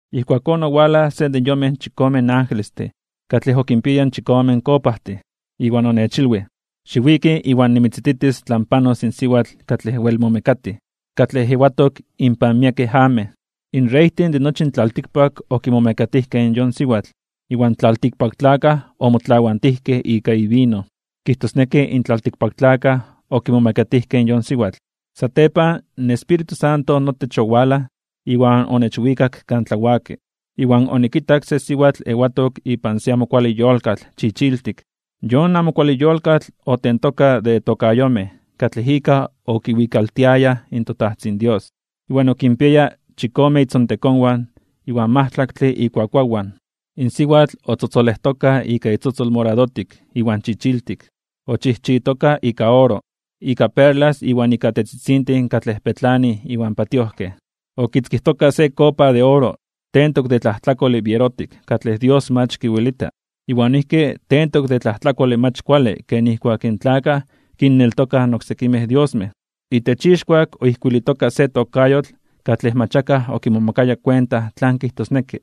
Ijkuakón owalaj se de yonmej chikome angelestin katlej okinpiayaj in chikome kopajtin, iwan onechilwij: ―Xiwiki iwan nimitzititis tlan panos in siwatl katlej wel momekatij, katlej ewatok inpan miekej amej. In reytin de nochi in tlaltikpak okimomekatijkej in yon siwatl. Iwan tlaltikpaktlakaj omotlawantijkej ika ivino, kijtosneki in tlaltikpaktlakaj okimomekatijkej in yon siwatl. Satepan in Espíritu Santo notech owalaj iwan onechwikak kan tlawaki, iwan onikitak se siwatl ewatok ipan se amo kuale yolkatl chichiltik. Yon amo kuale yolkatl otentoka de tokayomej katlej ika okiwikaltiayaj in toTajtzin Dios, iwan okinpiaya chikome itzontekonwan iwan majtlaktle ikuakuawan. In siwatl otzotzolejtoka ika itzotzol moradotik iwan chichiltik. Ochijchitoka ika oro, ika perlas iwan ika tetzitzintin katlej petlanij iwan patiojkej. Okitzkijtoka se kopa de oro tentok de tlajtlakole bierotik katlej Dios mach kiwelita, iwan noijki tentok de tlajtlakole mach kuale ken nijkuak in tlakaj kinneltokaj oksekimej diosmej. Itech ixkuak oijkuilitoka se tokayotl katlej mach akaj okimomakaya kuenta tlan kijtosneki.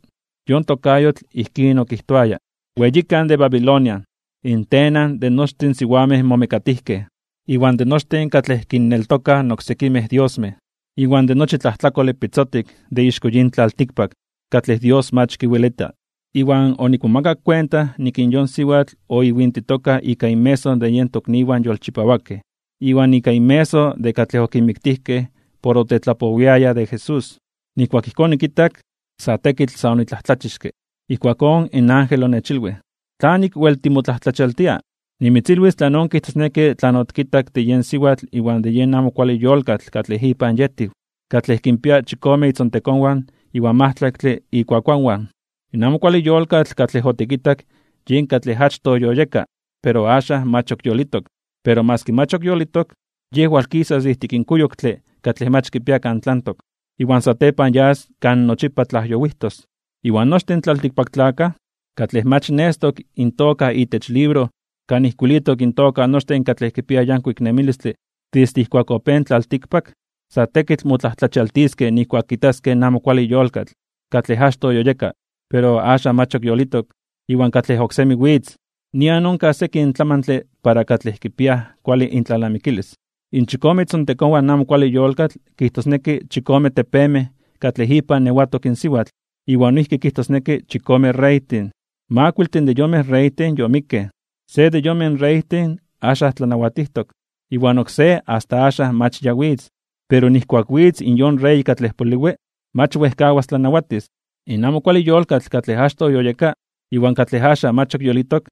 Yon tokayotl ijkín okijtoayaj: “Weyikan de Babilonia, in tenan de nochtin in siwamej momekatijkej, iwan de nochtin katlej kinneltokaj oksekimej diosmej, iwan de nochi tlajtlakole pitzotik de ixko yin tlaltikpak katlej Dios mach kiwelita.” Iwan onikmomakak kuenta nik in yon siwatl oiwintitoka ika inmeso de yen tokniwan yolchipawakej iwan ika inmeso de katlej okinmiktijkej por otetlapowiayaj de Jesús. Nijkuak ijkón onikitak, sa tekitl sa onitlajtlachixke (onimomajmawtij). Ijkuakón in ángel onechilwij: ―¿Tlanik wel timotlajtlachialtia (timomajmawtia)? Nimitzilwis tlanon kijtosneki tlan otikitak de yon siwatl iwan de yen amo kuale yolkatl katlej ipan yetiw, katlej kinpia chikome itzontekonwan iwan majtlaktle ikuakuawan. In amo kuale yolkatl katlej otikitak yen katlej achtoj yoyeka, pero axan mach ok yolitok. Pero maski mach ok yolitok, yej walkisas de ijtik kuyoktle katlej mach kipia kan tlantok, iwan satepan yas kan nochipa tlajyowijtos. Iwan nochtin in tlaltikpaktlakaj, katlej mach nestok intoka itech libro kan ijkuilitok intoka nochtin katlej kipiaj yankuik nemilistle desde ijkuak opéj in tlaltikpak, sa tekitl motlajtlachialtiskej (momajmawtiskej) nijkuak kitaskej in amo kuale yolkatl, katlej achtoj yoyeka, pero axan mach yolitok, iwan katlej oksemi witz. ’Nian onkaj sekin tlamantle para katlej kipiaj kuale intlalnamikilis: In chikome itzontekonwan in amo kuale yolkatl kijtosneki chikome tepemej katlej ipan ewatok in siwatl, iwan noijki kijtosneki chikomen reytin. Makuiltin de yonmej reytin yomikkej. Se de yonmej reytin axan tlanawatijtok, iwan oksé asta axan mach ya witz. Pero nijkuak witz in yon rey katlej poliwi, mach wejkawas tlanawatis. In amo kuale yolkatl katlej achtoj yoyeka, iwan katlej axan mach ok yolitok,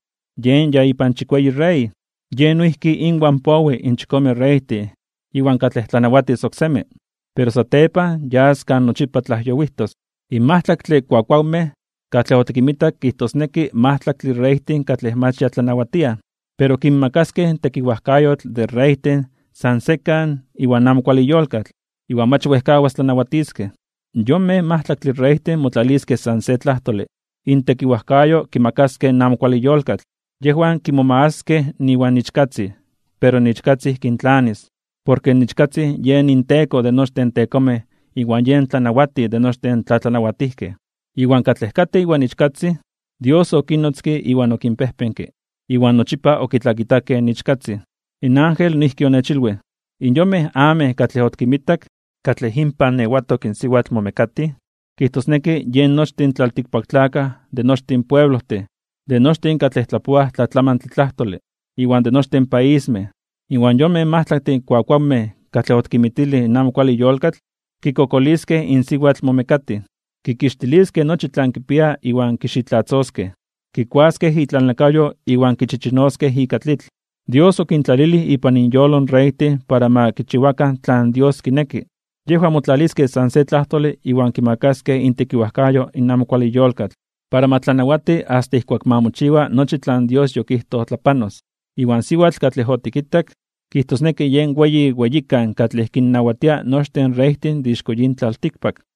yen ya ipan chikueyi rey. Yej noijki inwan powi in chikome reytin iwan katlej tlanawatis oksemi, pero satepan yas kan nochipa tlajyowijtos. ’In majtlaktle kuakuawmej katlej otikinmitak kijtosneki majtlaktle reytin katlej mach ya tlanawatiaj. Pero kinmakaskej tekiwajkayotl de reytin san sekan iwan amo kuale yolkatl, iwan mach wejkawaskej tlanawatiskej. Yonmej majtlaktin reytin motlaliskej san se tlajtole, intekiwajkayo kimakaskej in amo kuale yolkatl. Yejwan kimomagaskej (kimomakaskej) iwan Ichkatzin, pero in Ichkatzin kintlanis. Porke in Ichkatzin yen inTeko de nochtin in tekomej iwan yen Tlanawatij de nochtin in tlatlanawatijkej. Iwan katlej katej iwan Ichkatzin, Dios okinnotzke iwan okinpejpenke, iwan nochipa okitlakitakej in Ichkatzin. In ángel noijki onechilwij: ―In yonmej amej katlej otikinmitak, katlej inpan ewatok in siwatl momekatij, kijtosneki yen nochtin in tlaltikpaktlakaj de nochtin pueblojtin, de nochtin katlej tlapoaj tlatlamantle tlajtole, iwan de nochtin paismej. Iwan yonmej majtlaktin kuakuawmej katlej otikinmitilij in amo kuale yolkatl, kikokoliskej in siwatl momekatij. Kikixtiliskej nochi tlan kipia iwan kixitlatzoskej. Kikuaskej itlalnakayo iwan kichichinoskej ika tlitl. Dios okintlalilij ipan inyolo in reytin para ma kichiwakan tlan Dios kineki. Yejwan motlaliskej san se tlajtole iwan kimakaskej intekiwajkayo in amo kuale yolkatl, para ma tlanawati asta ijkuak ma mochiwa nochi tlan Dios yokijtoj tlapanos. Iwan siwatl katlej otikitak, kijtosneki yen weyi weyikan katlej kinnawatia nochtin in reytin de ixko yin tlaltikpak.